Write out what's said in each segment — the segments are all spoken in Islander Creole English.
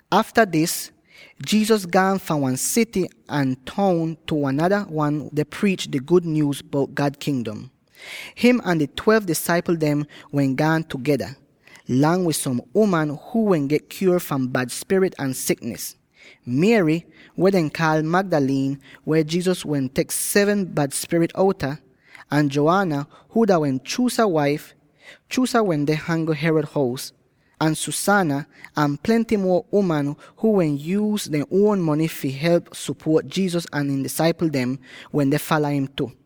Afta dis, Jesus gaan fahn wan sity ahn toun tu wan nada wan deh priich di gud nyuuz bout God Kingdom. Him ahn di twelve disaipl dem wehn gaan tugeda, lang wid som uman huu wehn get kyuor fahn bad spirit ahn siknis: Mary, weh dehn kaal Magdalene, weh Jesus tek seven bad spirit outa, ahn Joanna, huu dah wehn Chuza waif —Chuza wende hangl Herod hous— ahn Susanna, ahn plenty muo uman, huu wehn yuuz dehn uon mony fi help sopuot Jesus ahn ihn disaipl dem, wende fala im tu.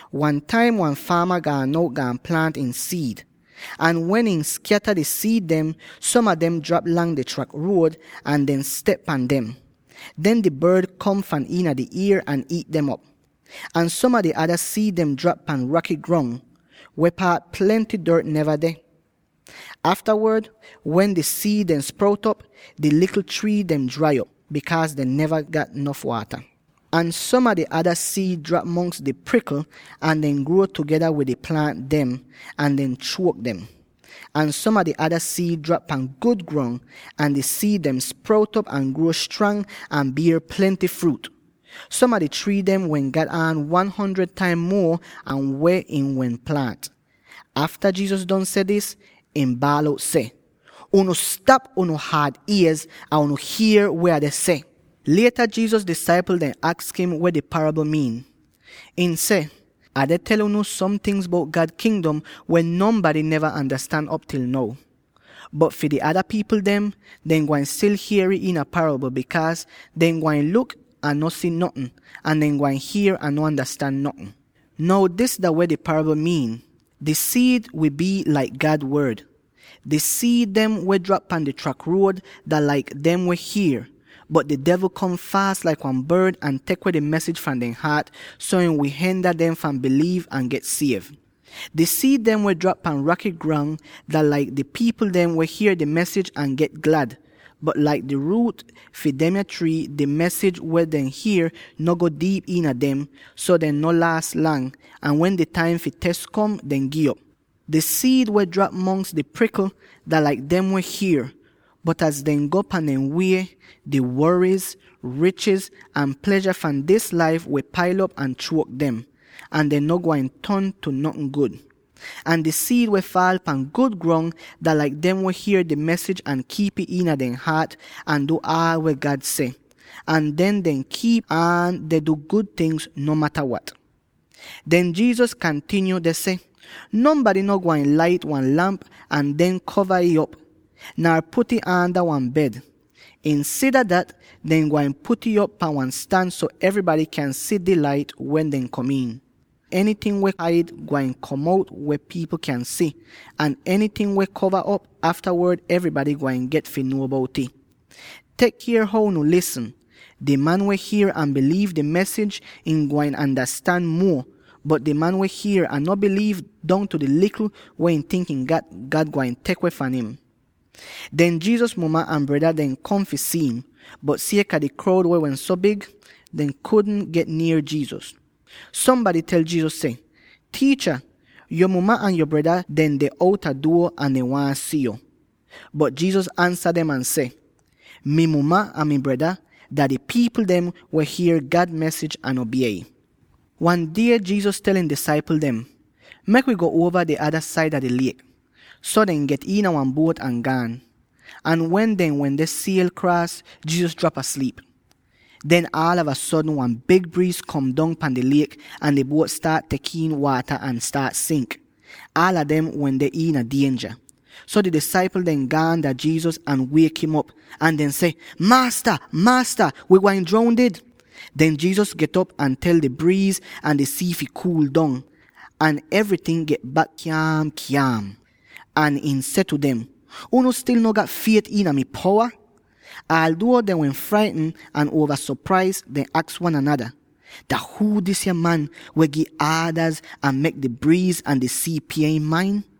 “Wan taim wan faama gaan out, gaan plaant ihn siid. Ahn wen ihn skyata di siid dem, som a dem drap lang di trak ruod, ahn dehn step pan dem. Den di bord kom fahn iina di ier ahn iit dem op. Ahn som a di ada siid dehn drap pan raky grong, weh paat plenty dort neva deh. Aftawod wen di siid dem sprout op, di likl trii dem drai op, bikaaz dehn neva get nof waata. Ahn som a di ada siid drap mongs di prikl, ahn dehn gruo tugeda wid di plaant dem, ahn dehn chuok dem. Ahn som a di ada siid drap pan gud grong. Ahn di siid dem sprout op ahn gruo strang ahn bier plenty fruut; som a di trii dehn wehn gat aan one hundred taim muo an weh ihn wehn plaant!” Afta Jesus don seh dis, ihn baal out seh, “Unu stap unu haad iez, ahn unu hier weh Ah deh seh!” Lieta Jesus disaipl dem aks im weh di parabl miin. Ihn seh, “Ah deh tel unu som tingz bout God Kingdom weh nonbady neva andastan op til now. Bot fi di ada pipl dem, dehn gwain stil hier'ih iina parabl, bikaaz: ‘Dehn gwain luk, ahn no si notn; ahn dehn gwain hier, ahn no andastan notn.’ “Now dis dah weh di parabl miin: di siid wi bii laik God Wod. Di siid dem weh drap pan di trak ruod dah laik dem weh hier. Bot di devl kom faas laik wan bord ahn tek weh di mesij fahn dehn haat, so ihn wi henda dem fahn biliiv ahn get siev. Di siid dem weh drap pan raky grong dah laik di pipl dem weh hier di mesij ahn get glad. Bot laik di ruut fi demya trii, di mesij weh dehn hier no go diip iina dem. So, dehn no laas lang, ahn wen di taim fi tes kom, dehn gi'op. Di siid weh drap mongs di prikl dah laik dem weh hier, bot az dehn go pahn dehn wie, di woriz, richiz ahn plezha fahn dis laif wi pail op ahn chuok dem, ahn dehn no gwain ton tu notn gud. Ahn di siid weh faal pahn gud grong, dah laik dem weh hier di mesij ahn kiip'ih iina dehn haat ahn du aal weh God seh. Ahn den dehn kiip aan deh du gud tingz, no mata wat.” Den Jesus kantinyo deh seh, “Nonbady no gwain lait wan lamp ahn den kova ih op, nar put'ih aanda wan bed. Insida dat dehn gwain put'ih op pan wan stan so evrybady kyan si di lait wen dehn kom iin. “Enyting weh haid, gwain kom out weh pipl kyan si, ahn enyting weh kova op, aftawod evrybady gwain get fi nuo bout'ih. “Tek kier how unu lisn: di man weh hier ahn biliiv dis mesij, ihn gwain andastan muo, bot di man weh hier ahn no biliiv, dongtu di likl weh ihn tink ihn gat, God gwain tek weh fahn im.” Den Jesus muma ahn breda dem kom fi si'im, bot sieka di kroud wehn so big, dehn kudn get nier Jesus. Sombady tel Jesus seh, “Tiicha, yo muma ahn yo breda dem deh outa duo, ahn dehn waahn si yo.” Bot Jesus ansa dem ahn seh, “Mi muma ahn mi breda dah di pipl dem weh hier God mesij ahn obie ih.” Wan die Jesus tel ihn disaipl dem, “Mek wi go uova di ada saida di liek.” So dehn get iina wan buot ahn gaan. Ahn wen dehn wende siel kraas, Jesus drap asliip. Den aalava sodn wan big briiz kom dong pahn di liek, ahn di buot staat tek iin waata ahn staat sink. Aala dem wende iina dienja! So di disaipl dem gaan dah Jesus ahn wiek'im op, ahn dehn seh, “Maasta! Maasta! wi gwain droundid.” Den Jesus get'op ahn tel di briiz ahn di sii fi kuul dong, ahn evryting get bak kyaam-kyaam! Ahn ihn seh tu dem, “Unu stil no gat fiet iina mi powa?” Alduo dehn wehn fraitn ahn uova sopraiz, dehn aks wan anada, “Dah huu disa man weh gi aadaz ahn mek di briiz ahn di sii pie im main?”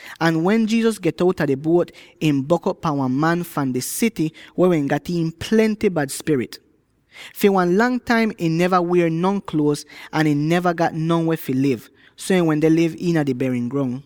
Ahn wen Jesus get outa di buot, ihn bok'op pan wan man fahn di sity weh wehn gat iin plenty bad spirit. Fi wan lang taim ihn neva wier non kluoz, ahn ihn neva gat no weh fi liv, so ih wende liv iina di berin grong.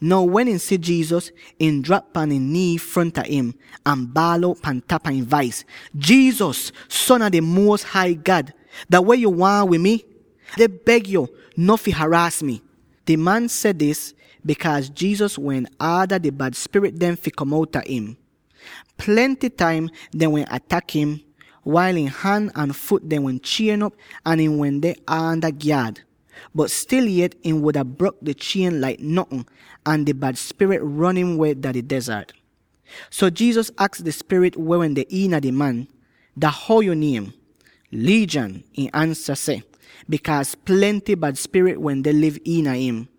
Now wen ihn si Jesus, ihn drap pan ihn nii fronta im, ahn baal out pan tapa ihn vais, “Jesus, Son a di Muos Hai God, dah weh yo waahn wid mi? Ah deh beg yo, no fi haraas mi!” Di man seh dis, bikaaz Jesus wehn aada di bad spirit dem fi kom outa im. Plenty taim dehn wehn atak im —wail ihn han ahn fut dem wehn chien'op ahn ihn wehn aanda gyaad— bot stil yet ihn wuda brok di chien laik notn, ahn di bad spirit ron im weh dah di dezart. So Jesus aks di spirit weh wende iina di man, “Dah how yo niem?” “Legion!” ihn ansa seh —bikaaz plenty bad spirit wende liv iina im.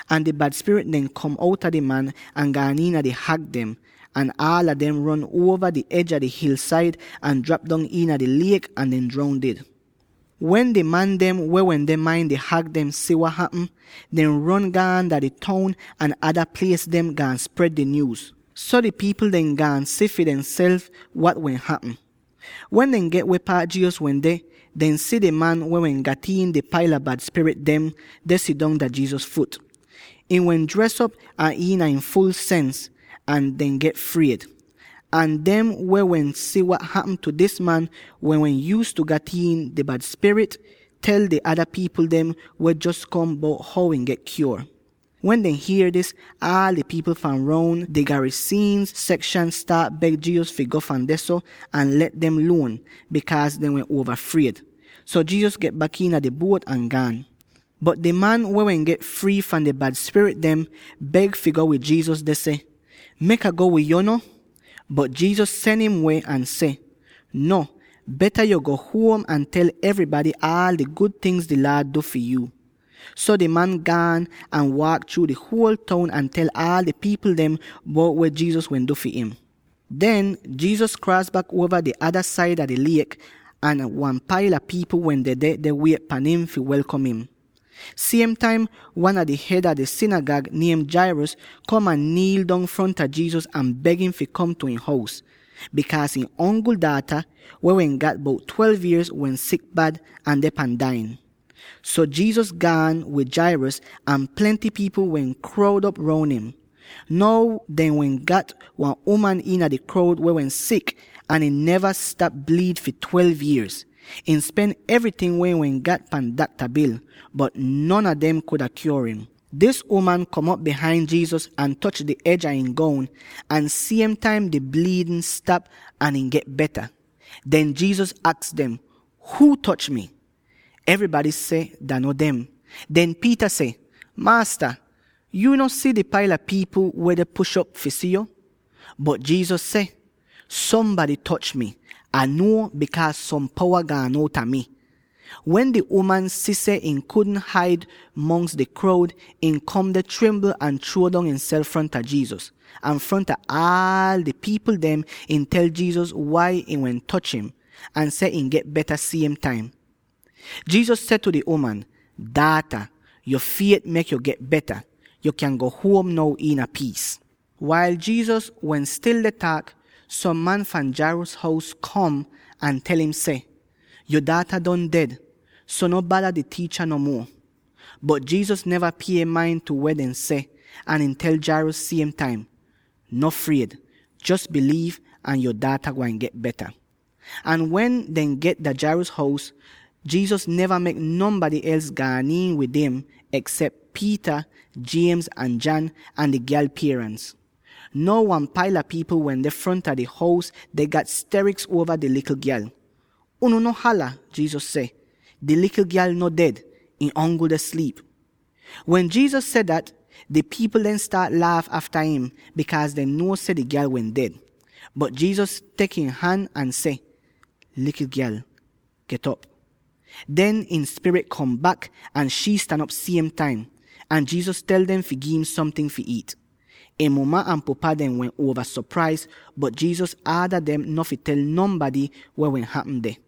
Ahn di bad spirit dem kom outa di man, ahn gaan iina di hag dem, ahn aala dem ron uova di ej a di hilsaid, ahn drap dong iina di liek ahn dehn droundid! Wen di man dem weh wende main di hag dem si wat hapm, dehn ron gaan dah di toun ahn ada plies dem, gaan spred di nyuuz. So di pipl dehn gaan si fi demself wat wehn hapm. Wen dehn get weh paat Jesus wende, dehn si di man weh wehn gat iin di paila bad spirit dem, deh sidong dah Jesus fut. Ihn wehn dres op, ahn iina ihn ful sens, ahn dehn get fried. Ahn dem weh wehn si wat hapm tu dis man —weh wehn yuuztu gat iin di bad spirit— tel di ada pipl dem weh wehn jos kom, bout how ihn get kyuor. Wen dehn hier dis, aal di pipl fahn roun di Garasenes sekshan staat beg Jesus fi go fahn dehso, ahn let dem luon, bikaaz dehn wehn uova fried. So Jesus get bak iina di buot ahn gaan. Bot di man weh wehn get frii fahn di bad spirit dem, beg fi go wid Jesus, deh seh, “Mek Ah go wid yo no!” Bot Jesus sen im weh, ahn seh, “No, beta yo go bak huom ahn tel evrybady aal di gud tingz weh di Laad du fi yu.” So di man gaan ahn waak chruu di houl toun ahn tel aal di pipl dem bout weh Jesus wehn du fi him. Den, Jesus kraas bak uova di ada saida di liek, ahn wan paila pipl wehn dedeh, deh wiet pahn im fi welkom im. Siem taim wan a di hed a di sinigag, niem Jairus, kom ahn niil dong fronta Jesus ahn beg im fi kom tu ihn hous, bikaaz ihn ongl daata —weh wehn gat bout twelve yierz— wehn sik bad, ahn deh pan dai'in. So Jesus gaan wid Jairus, ahn plenty pipl wehn kroud op roun im. Now dehn wehn gat wan uman iina di kroud weh wehn sik, ahn ihn neva stap bliid fi twelve yierz. Ihn spen evryting weh ihn wehn gat pan dakta bil, bot non a dem kudn kyuor im. Dis uman kom op bihain Jesus ahn toch di ej a ihn goun, ahn siem taim di bliidn stap ahn ihn get beta. Den Jesus aks dem, “Huu toch mi?” Evrybady seh, dah no dem. Den Peter seh, “Maasta, yu no si di paila pipl weh deh push op fi si yo?” Bot Jesus seh, “Sombady toch mi; Ah nuo, bikaaz som powa gaan outa mi.” Wen di uman si seh ihn kudn haid mongs di kroud, ihn kom deh trimbl ahn chruo dong imself fronta Jesus. Ahn fronta aal di pipl dem ihn tel Jesus wai ihn wehn toch im, ahn seh ihn get beta siem taim. Jesus seh tu di uman, “Daata, yo fiet mek yo get beta. Yo kyan go huom now iina piis.” Wail Jesus wehn stil deh taak, som man fahn Jairus hous kom, ahn tel im seh, “Yo daata don ded; so no bada di tiicha no muo.” Bot Jesus neva pie main tu weh dehn seh, ahn ihn tel Jairus siem taim, “No fried; jos biliiv ahn yo daata gwain get beta.” Ahn wen dehn get dah Jairus hous, Jesus neva mek nonbady els gaan iin wid im eksep Peter, James, ahn John, ahn di gyal pierans. Now, wan paila pipl wende fronta di hous deh gat steriks uova di likl gyal. “Unu no hala!” Jesus seh, “Di likl gyal no ded; ihn ongl deh sliip.” Wen Jesus seh dat, di pipl dem staat laaf afta im, bikaaz dehn nuo seh di gyal wehn ded. Bot Jesus tek ihn han ahn seh, “Likl gyal, get'op!” Den ihn spirit kom bak, ahn shii stan op siem taim! Ahn Jesus tel dem fi gi'im somting fi iit. Ihn muma ahn pupa dem wehn uova sopraiz, bot Jesus aada dem no fi tel nonbady weh wehn hapm deh.